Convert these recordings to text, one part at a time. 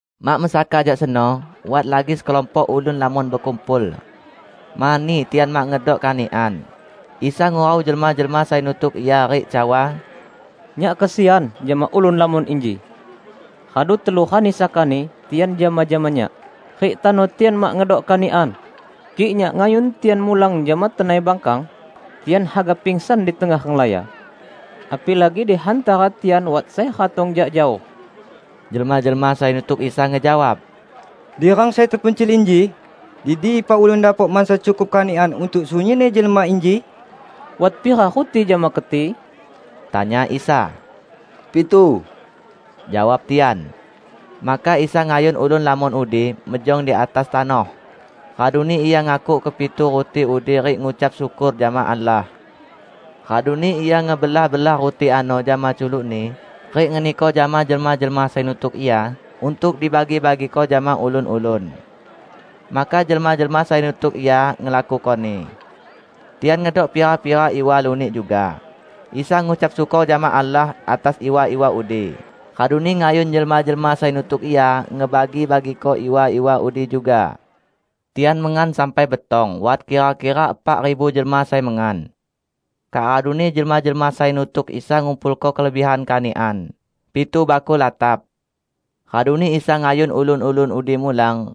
Mak mesaka jak seno, wat lagi sekelompok ulun lamon bekumpul. Mani tian mak ngedok kanikan, Isa ngurau jelma-jelma sai nutuk Ia rik cawa, "Nyak kesian jama ulun lamon inji. Radu telu rani sakani tian jama-jama Nyak, rik tano tian mak ngedok kanikan. Kik Nyak ngayun tian mulang jama tenai bangkang, tian haga pangsan di tengah renglaya. Apilagi di hantara tian wat sai ratong jak jaoh." Jelma-jelma sai nutuk Isa ngejawab, "Di rang sai tepencil inji, di dipa ulun dapok mansa cukup kanikan untuk sunyinni jelma inji?" "Wat pira ruti jama keti?" tanya Isa. "Pitu," jawab tian. Maka Isa ngayun ulun lamon udi mejong di atas tanoh, raduni Ia ngakuk kepitu ruti udi rik ngucap syukor jama Allah. Raduni Ia ngebelah-belah ruti ano jama culuk-Ni rik ngeniko jama jelma-jelma sai nutuk Ia untuk dibagi-bagiko jama ulun-ulun. Maka jelma-jelma sai nutuk Ia ngelakukoni. Tian ngedok pira-pira iwa lunik juga. Isa ngucap syukor jama Allah atas iwa-iwa udi, raduni ngayun jelma-jelma sai nutuk Ia ngebagi-bagiko iwa-iwa udi juga. Tian mengan sampai betong -- wat kira-kira epak ribu jelma sai mengan. Kak raduni jelma-jelma sai nutuk Isa ngumpulko kelebihan kanikan -- pitu bakul latap. Raduni Isa ngayun ulun-ulun udi mulang,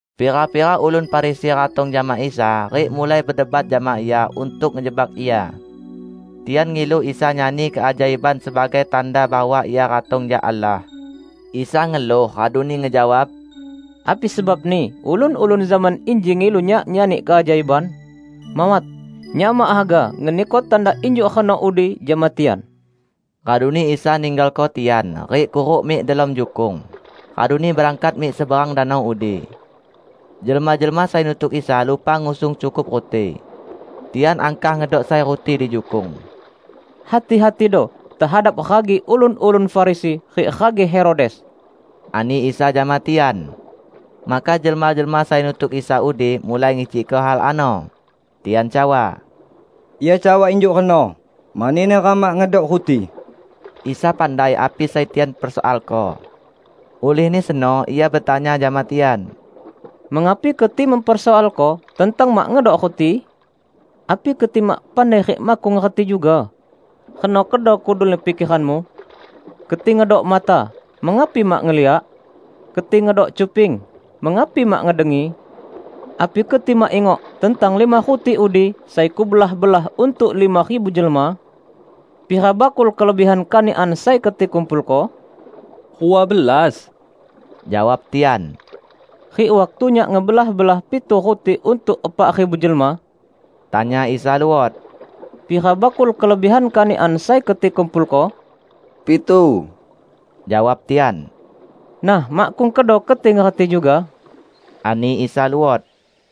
Pira-pira ulun Farisi ratong jama Isa, rik mulai bedebat jama Ia untuk ngejebak Ia. Tian ngilu Isa nyani keajaiban sebagai tanda bahwa Ia ratong jak Allah. Isa ngeluh raduni ngejawab, "Api sebabni ulun-ulun zaman inji ngilu Nyak nyani keajaiban? Mawat! Nyak mak haga ngeniko tanda injuk reno udi jama tian!" Raduni Isa ninggalko tian, rik kuruk mik delom jukung; raduni berangkat mik seberang danau udi. Jelma-jelma sai nutuk Isa lupa ngusung cukup ruti. Tian angkah ngedok sai ruti di jukung. "Hati-hatido tehadap ragi ulun-ulun Farisi rik ragi Herodes," ani Isa jama tian. Maka jelma-jelma sai nutuk Isa udi mulai ngicikko hal ano. Tian cawa, "Ia cawa injuk reno, mani neram mak ngedok ruti." Isa pandai api sai tian persoalko. Ulihni seno Ia betanya jama tian, "Mengapi keti mempersoalko tentang mak ngedok ruti? Api keti mak pandai rik makkung ngerti juga? Reno kedo kudulni pikeranmu? Keti ngedok mata -- mengapi mak ngeliak? Keti ngedok cuping -- mengapi mak ngedengi? Api keti mak ingok tentang lima ruti udi sai Kubelah-belah untuk lima ribu jelma? Pira bakul kelebihan kanikan sai keti kumpulko?" "Rua belas," jawab tian. "Rik waktu Nyak ngebelah-belah pitu ruti untuk epak ribu jelma," tanya Isa luot, "pira bakul kelebihan kanikan sai keti kumpulko?" "Pitu," jawab tian. "Nah, makkung kedo keti ngerti juga?" ani Isa luot.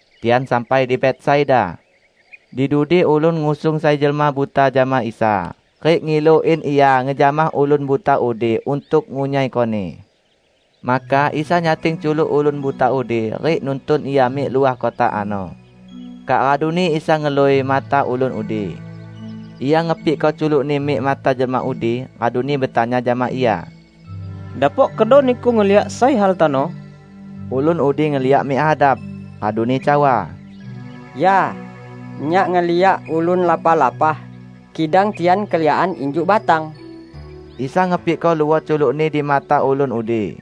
Tian sampai di Betsaida. Di dudi ulun ngusung sai jelma buta jama Isa, rik ngilu in Ia ngejamah ulun buta udi untuk ngunyaikoni. Maka Isa nyating culuk ulun buta udi rik nuntun ia mik luah kota ano. Kak raduni Isa ngelui mata ulun udi. Ia ngepikko culuk-Ni mik mata jelma udi, raduni betanya jama ia, "Dapok kedo niku ngeliak sai hal tano?" Ulun udi ngeliak mik hadap, raduni cawa, "Ya. Nyak ngeliak ulun lapah-lapah; kidang tian keliakan injuk batang." Isa ngepikko luot culuk-Ni di mata ulun udi.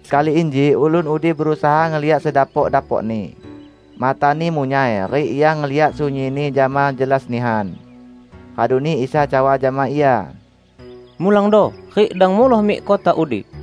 Sekali inji ulun udi berusaha ngeliak sedapok-dapokni. Matani munyai, rik ia ngeliak sunyinni jama jelas nihan. Raduni Isa cawa jama ia, "Mulangdo, rik dang muloh mik kota udi."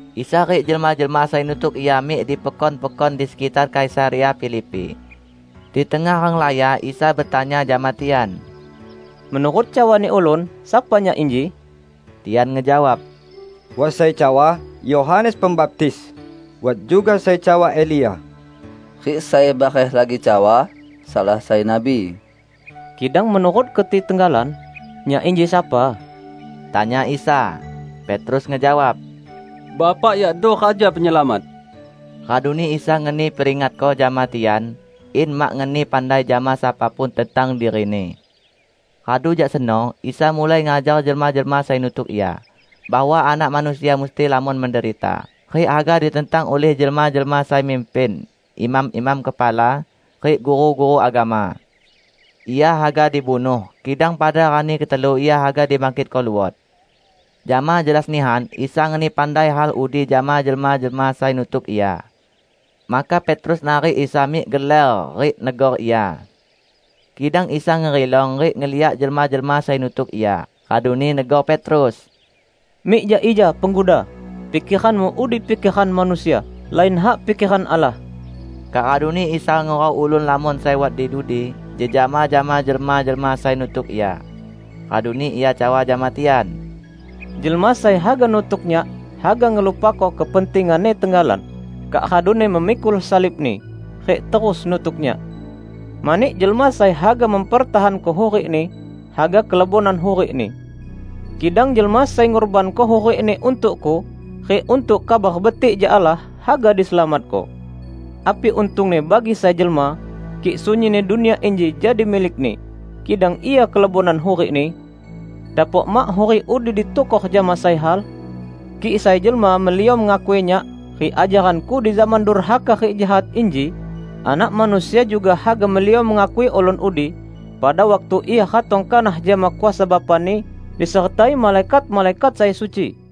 Isa rik jelma-jelma sai nutuk Ia mik di pekon-pekon di sekitar Kaisarea Filipi. Di tengah renglaya Isa betanya jama tian, "Menurut cawani ulun, sapa Nyak inji?" Tian ngejawab, "Wat sai cawa: Yohanes Pembaptis; wat juga sai cawa Elia, rik sai bareh lagi cawa: salah sai nabi." "Kidang menurut keti tenggalan, Nyak inji sapa?" tanya Isa. Petrus ngejawab, "Bapak yakdo Raja Penyelamat!" Raduni Isa ngeni peringatko jama tian, in mak ngeni pandai jama sapa pun tentang diri-Ni. Radu jak seno, Isa mulai ngajar jelma-jelma sai nutuk Ia bahwa Anak Manusia musti lamon menderita, rik haga ditentang ulih jelma-jelma sai mimpin, imam-imam kepala, rik guru-guru agama. Ia haga dibunuh, kidang pada rani ketelu Ia haga dibangkitko luot. Jama jelas nihan Isa ngeni pandai hal udi jama jelma-jelma sai nutuk Ia. Maka Petrus narik Isa mik geler, rik negor Ia. Kidang Isa ngerilong rik ngeliak jelma-jelma sai nutuk Ia, raduni negor Petrus, "Mik jak ija, Pengguda! Pikeranmu udi pikeran manusia; lain hak pikeran Allah!" Kak raduni Isa ngurau ulun lamon sai wat di dudi jejama jama jelma-jelma sai nutuk Ia. Raduni Ia cawa jama tian, "Jelma sai haga nutuk Nyak, haga ngelupako kepentinganni tenggalan, kak raduni memikul salibni, rik terus nutuk Nyak. Mani jelma sai haga mempertahanko hurikni, haga kelebonan hurikni. Kidang jelma sai ngurbanko hurikni untuk-Ku rik untuk Kabar Betik jak Allah, haga diselamatko. Api untungni bagi sai jelma, kik sunyinni dunia inji jadi milikni, kidang ia kelebonan hurikni? Dapok mak hurik udi ditukor jama sai hal? Kik sai jelma meliom ngakui Nyak rik ajaran-Ku di zaman durhaka rik jahat inji, Anak Manusia juga haga meliom ngakui ulun udi, pada waktu Ia ratong kanah jama kuasa Bapa-Ni, disertai malaikat-malaikat sai suci."